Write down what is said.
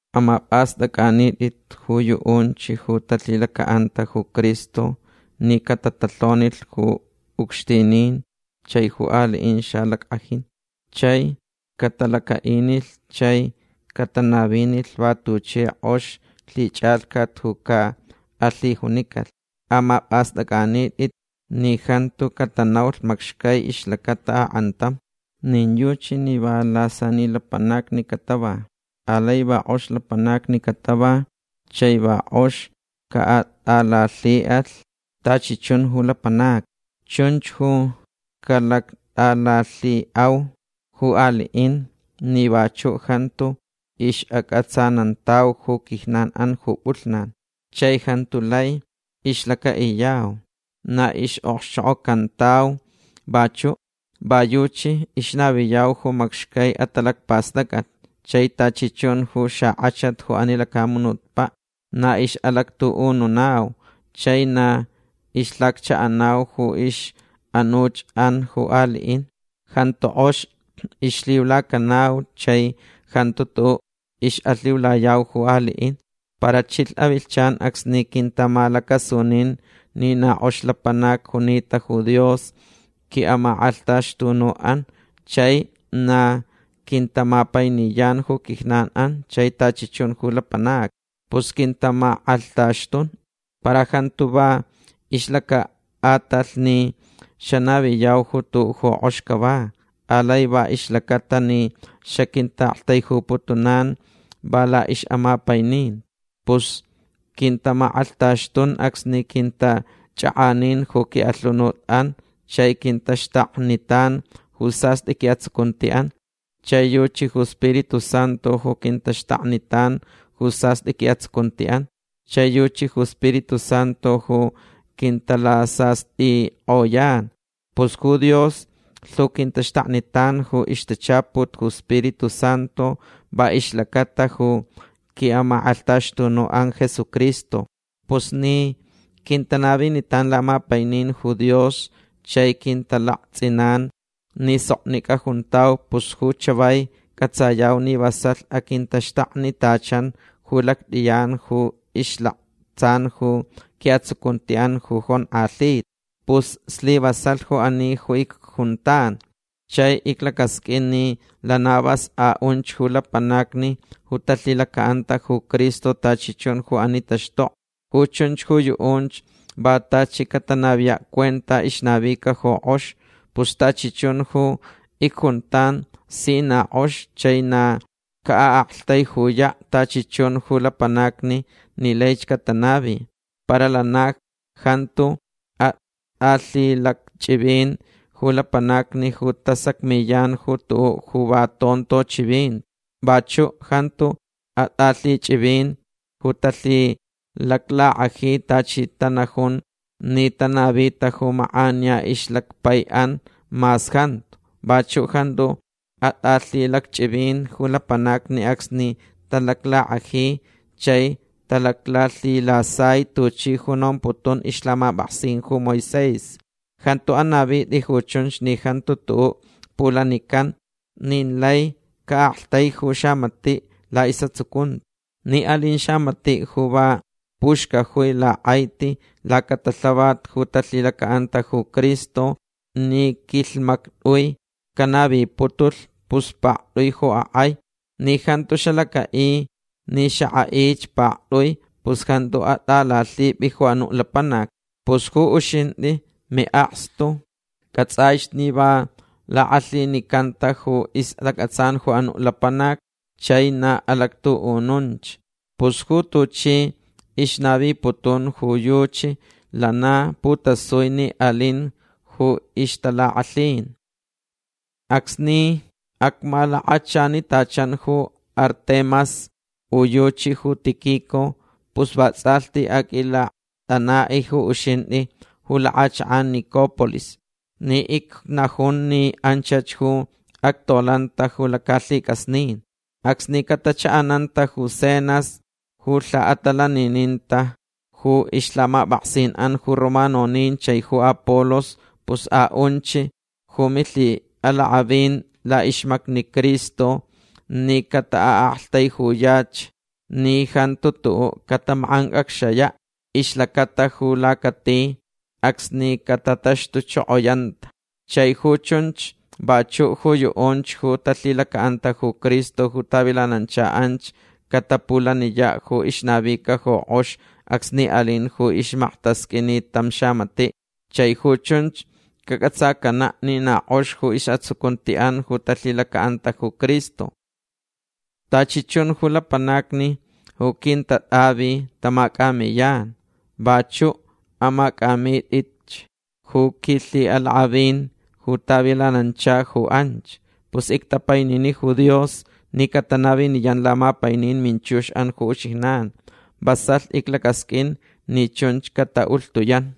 Amapʼastʼacʼanitʼich ju yuʼunch ju talhilacaʼanta ju Cristo ni catatalhonilh ju ucxtinin chai ju aliʼin xalackʼajin. Chai catalacaʼinilh chai catanavinilh va tuchi kʼox lhichʼalhcat ju caʼalhijunicalh. Amapʼastʼacʼanitʼich ni jantu catanaulh macxcai ixlacata akʼantam. Nin yuchi ni va lasani lapanacni catava. Alai na kʼox lapanacni catava chai va kʼox caʼatʼalalhiʼalh tachi chun ju lapanacni. Chunch ju calactʼalalhiʼau ju aliʼin ni vachuʼ jantu ixʼacʼatsanantauch ju quijnanʼan ju pʼulhnan. Chai jantu lai ixlacaʼiyau. Na ixʼokxchokʼocantau vachuʼ. Va yuchi ixnaviyau ju macxcai atalacpastʼacʼat chai tachi chun ju xakʼachat ju ani lacamunutpaʼ. Na ixʼalactuʼununau chai na ixlhacchaʼanau ju ixʼanuchʼan ju aliʼin. Jantu kʼox ixlhiulacanau chai jantu tuʼuʼ ixʼalhiulayau ju aliʼin. Para chilh avilhchan acsni quintamalacasunin ni na kʼox lapanac junita ju Dios quiʼamakʼalhtaxtunuʼan chai na quintamapainiyan ju quijnanʼan chai tachi chun ju lapanacni. Pus quintamakʼalhtaxtun. Para jantu va ixlacaʼatalh ni xanaviyau ju tuʼuʼ ju kʼox cava. Alai va ixlacata ni xaquintaʼaktaijuputunan va laʼixʼamapaininti. Pus quintamakʼalhtaxtun acsni quintachʼakʼanin ju quiʼalhunutʼan chai quintaxtaknitan ju sastʼi quiʼatsucuntiʼan. Chai yuchi ju Spiritu Santu ju quintaxtaknitan ju sastʼi quiʼatsucuntiʼan. Chai yuchi ju Spiritu Santu ju quintalasastʼikʼoyan. Pus ju Dios lhu quintaxtaknitan ju ixtachaput ju Spiritu Santu va ixlacata ju quiʼamakʼalhtaxtunuʼan Jesucristo. Pus ni quintanavinitan lamapainin ju Dios chai quintalaktsʼinan ni soknicʼa juntau pus ju chavai cʼatsayau ni vasalh aquintaxtaknitachan ju lactʼiyan ju ixlaktsan ju quiʼatsucuntiʼan ju jonkʼalhita. Pus slivasalh ju ani ju icjuntan. Chai iclacasqʼuin ni lana vas aʼunch ju lapanacni ju talhilacaʼanta ju Cristo tachi chun ju ani taxtokni. Ju chunch ju yuʼunch va tachi catanaviyaʼ cuenta ixnavica ju kʼox. Pus tachi chun ju icjuntan si na kʼox chai na caʼaʼaktaijuyaʼ tachi chun ju lapanacni ni laich catanavi. Para lana jantu atʼalhilacchʼivin ju lapanacni ju tasacmiyan ju tuʼuʼ ju va tonto chivinti. Vachuʼ jantu atʼalhilacchʼivin ju talhilaclakʼaji tuchi tanajun ni tanavita ju makʼaniya ixlacpaiʼan mas jantu. Vachuʼ jantu atʼalhilacchʼivin ju lapanacni acsni talaclakʼaji chai talaclhilasai tuchi ju nomputun ixlhamapʼaksin ju Moisés. Jantu anavitʼi ju chunch ni jantu tuʼuʼ pulanican nin lai caʼaktaiju xamatiʼ laʼisʼatsucunti. Ni alin xamatiʼ ju va puxcajui lakʼaiti lacatalhavat ju talhilacaʼanta ju Cristo ni quilhmactʼui canaviputulh pus paktʼui ju akʼai. Ni jantu xalacaʼi ni xakʼaʼich paktʼui pus jantu atʼalalhipʼi ju anuʼ lapanac. Pus ju uxintʼi miʼakstu cʼatsʼaich ni va lakʼalhinicanta ju istacʼatsan ju anuʼ lapanac chai na alactuʼununch. Pus ju tuchi ixnaviputun ju yuchi lana putasui ni alinch ju ixtalakʼalhin. Acsni acmalakachanitachan ju Artemas u yuchi ju Tíquico pus vatsʼalhti aqʼuilaktʼanaʼ ju uxintʼi ju lakʼachakʼan Nicópolis ni icnajun ni anchach ju actolanta ju lacalhicʼasnin. Acsni catachaʼananta ju Zenas ju lhaʼatalanininta ju ixlhamapʼaksinʼan ju romanonin chai ju Apolos pus aʼunch ju milhiʼalakʼavin laʼixmacni Cristo ni cataʼaʼaktaijuyach ni jantu tuʼuʼ catamakʼancʼacxayaʼ ixlacata ju lacati acsni catataxtuchokoyanta. Chai ju chunch vachuʼ ju yuʼunch ju talhilacaʼanta ju Cristo ju tavilanancha anch catapulaniyaʼ ju ixnavica ju kʼox acsni alin ju ixmaktasqʼuinit tam xamatiʼ. Chai ju chunch cacʼatsacanaʼ ni na kʼox ju isʼatsucuntiʼan ju talhilacaʼanta ju Cristo. Tachi chun ju lapanacni ju quintatʼavi tamacʼamiyan. Vachuʼ amacʼamitʼich ju quilhiʼalakʼavin ju tavilanancha ju anch. Pus ictapainini ju Dios ni catanaviniyan lamapainin minchuxʼan ju uxijnan. Vasalh iclacasqʼuin ni chunch cataʼulhtuyan.